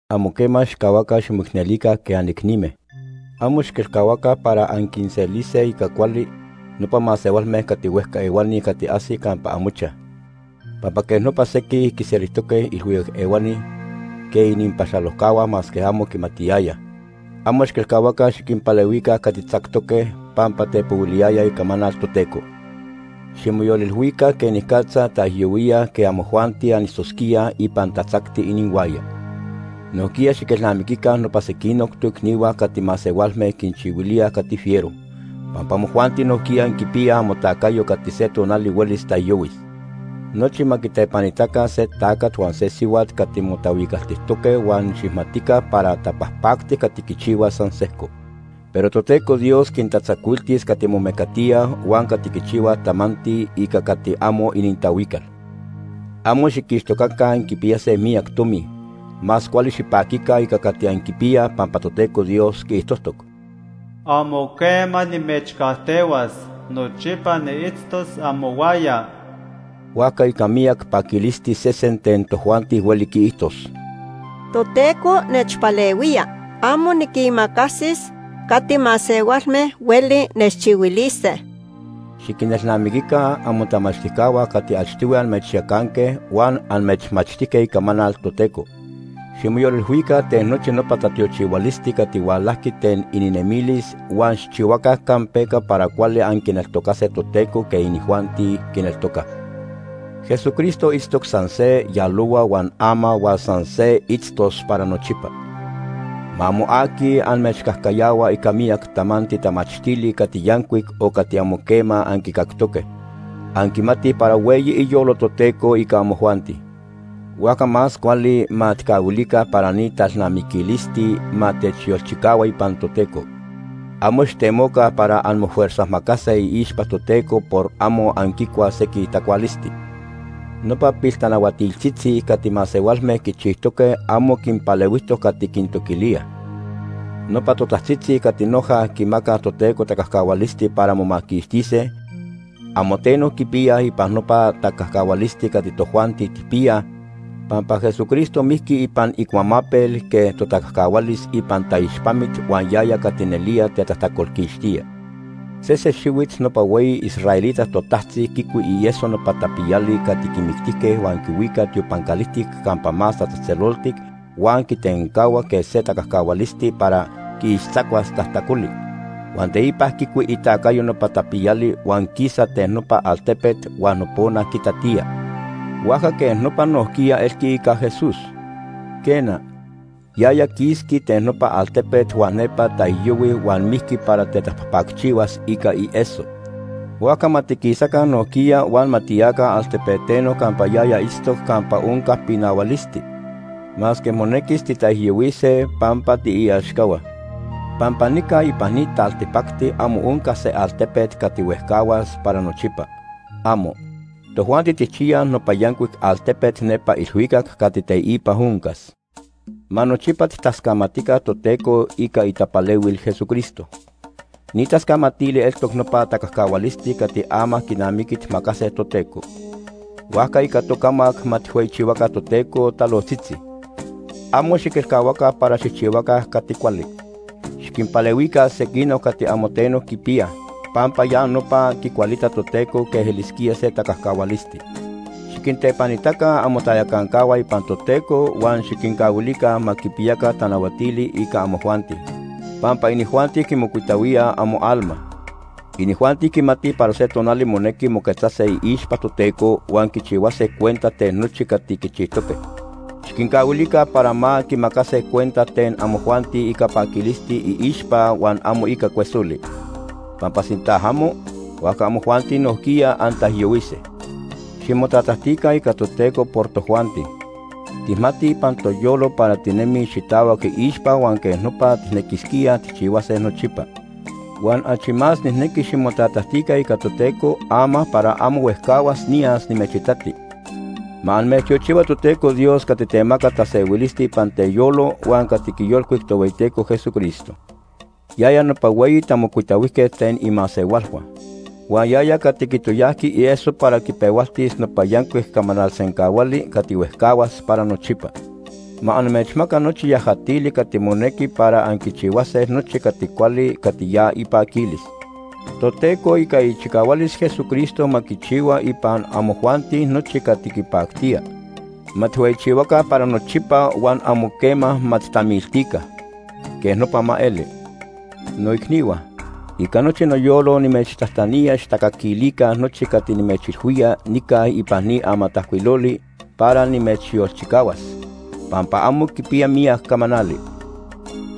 Amo quema xijcahuaca ximoicnelica quej anicnime. Amo xiquelcahuaca para anquinselise ica cuali, nopa masehualme cati huejca ehuani cati ajsij campa amochaj, pampa quej nopa sequij quinselijtoque ilhuicac ehuani quej ininpaxalojcahua masque amo quimatiyayaj. Amo xiquelcahuaca xiquinpalehuica cati tzactoque pampa tepohuiliyayaj icamanal Toteco. Ximoyolilhuica quenicatza taijyohuíaj quej amojuanti anitztosquíaj ipan tatzacti inihuaya. Nojquiya xiquinelnamiquica nopa sequinoc toicnihua cati masehualme quinchihuilíaj cati fiero, pampa amojuanti nojquiya anquipiyaj amotacayo cati se tonali huelis taijyohuis. Nochi ma quitepanitaca se tacat huan se sihuat cati motahuicaltijtoque huan xijmatica para tapajpactic cati quichihuaj san sejco. Pero Toteco Dios quintatzacuiltis cati momecatíaj huan cati quichihuaj tamanti ica cati amo inintahuical. Amo xiquixtocaca anquipiyase miyac tomi. Más cuali xipaquica ica cati anquipiyaj pampa Toteco Dios quiijtojtoc: “Amo quema nimechcajtehuas, nochipa niitztos amohuaya.” Huajca ica miyac paquilisti sesen ten tojuanti hueli quiijtos: “Toteco nechpalehuía. Amo niquimacasis cati masehualme hueli nechchihuilise.” Xiquinelnamiquica amotamachtijcahua cati achtohui amechyacanque huan amechmachtijque Icamanal Toteco. Ximoyolilhuica ten nochi nopa tatiochihualisti cati hualajqui ten ininemilis huan xijchihuaca campeca para cuali anquineltocase Toteco quej inijuanti quineltocaj. Jesucristo itztoc san se yalohua huan ama huan san se itztos para nochipa. Ma amo aqui amechcajcayahua ica miyac tamanti tamachtili cati yancuic o cati amo quema anquicactoque. Anquimatij para hueyi iyolo Toteco ica amojuanti, huajca más cuali ma tijcahuilica para ni talnamiquilisti ma techyolchicahua ipan Toteco. Amo xijtemoca para anmofuerzajmacase iixpa Toteco por amo anquicuaj sequij tacualisti. Nopa piltanahuatiltzitzi cati masehualme quichijtoque amo quinpalehuijtoc cati quintoquilíaj. Nopa totajtzitzi cati noja quimacaj Toteco tacajcahualisti para momaquixtise, amo teno quipiyaj ipan nopa tacajcahualisti cati tojuanti tijpiyaj. Pampa Jesucristo mijqui ipan icuamapel quej totacajcahualis ipan taixpamit huan yaya cati nelía tetajtacolquixtía. Sese xihuit nopa hueyi israelita totajtzi quicui ieso nopa tapiyali cati quimictijque huan quihuica tiopan calijtic Campa Más Tatzejtzeloltic huan quitencahua quej se tacajcahualisti para quiixtzacuas tajtacoli. Huan teipa quicui itacayo nopa tapiyali huan quisa ten nopa altepet huan nopona quitatía. Huajca quej nopa nojquiya elqui ica Jesús. Quena, yaya quisqui ten nopa altepet huan nepa taijyohui huan mijqui para tetapajpacchihuas ica ieso. Huajca ma tiquisaca nojquiya huan ma tiyaca altepeteno campa yaya itztoc campa onca pinahualisti, masque monequis titaijyohuise pampa tiiaxcahua. Pampa nica ipan ni taltipacti amo onca se altepet cati huejcahuas para nochipa. ¡Amo! Tojuanti tijchiyaj nopa yancuic altepet nepa ilhuicac cati teipa oncas. Ma nochipa tijtascamatica Toteco ica itapalehuil Jesucristo. Ni tascamatili eltoc nopa tacajcahualisti cati ama quinamiqui tijmacase Toteco. Huajca ica tocamac ma tijhueyichihuaca Toteco talojtzitzi. Amo xiquelcahuaca para xijchihuaca cati cuali. Xiquinpalehuica sequinoc cati amo teno quipiyaj, pampa ya nopa quicualita Toteco quej elisquía se tacajcahualisti. Xiquintepanitaca amotayacancahua ipan Toteco huan xiquincahuilica ma quipiyaca tanahuatili ica amojuanti, pampa inijuanti quimocuitahuíaj amoalma. Inijuanti quimatij para se tonali monequi moquetzase iixpa Toteco huan quichihuase cuenta ten nochi cati quichijtoque. Xiquincahuilica para ma quimacase cuenta ten amojuanti ica paquilisti iixpa huan amo ica cuesoli, pampa sinta amo, huajca amojuanti nojquiya antaijyohuise. Ximotatajtica ica Toteco por tojuanti. Tijmatij ipan toyolo para tinemij xitahuac iixpa huan quej nopa tijnequisquíaj tijchihuase nochipa. Huan achi más nijnequi ximotatajtica ica Toteco ama para amo huejcahuas niyas nimechitati. Ma amechtiochihua Toteco Dios cati temaca tasehuilisti ipan teyolo huan cati quiyolcuic Tohueyiteco Jesucristo. Yaya nopa hueyi tamocuitahuijquet ten imasehualhua. Huan yaya cati quitoyajqui ieso para quipehualtis nopa yancuic camanal sencahuali cati huejcahuas para nochipa. Ma amechmaca nochi yajatili cati monequi para anquichihuase nochi cati cuali cati ya ipaquilis. Toteco ica ichicahualis Jesucristo ma quichihua ipan amojuanti nochi cati quipactía. Ma tijhueyichihuaca para nochipa huan amo quema ma tijtamiltica. Quej nopa ma eli. Noicnihua, ica nochi noyolo nimechtajtanía xijtacaquilica nochi cati nimechilhuía nica ipan ni amatajcuiloli para nimechyolchicahuas, pampa amo quipiya miyac camanali.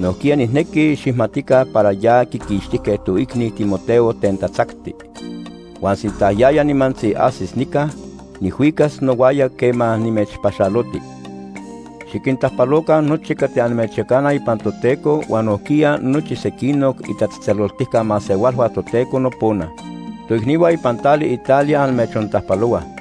Nojquiya nijnequi xijmatica para ya quiquixtijque toicni Timoteo ten tatzacti. Huan sinta yaya nimantzi ajsis nica, nijhuicas nohuaya quema nimechpaxaloti. Xiquintajpaloca nochi cati amechyacanaj ipan Toteco huan nojquiya nochi sequinoc itatzejtzeloltijca masehualhua Toteco nopona. Toicnihua ipan tali Italia amechontajpalohuaj.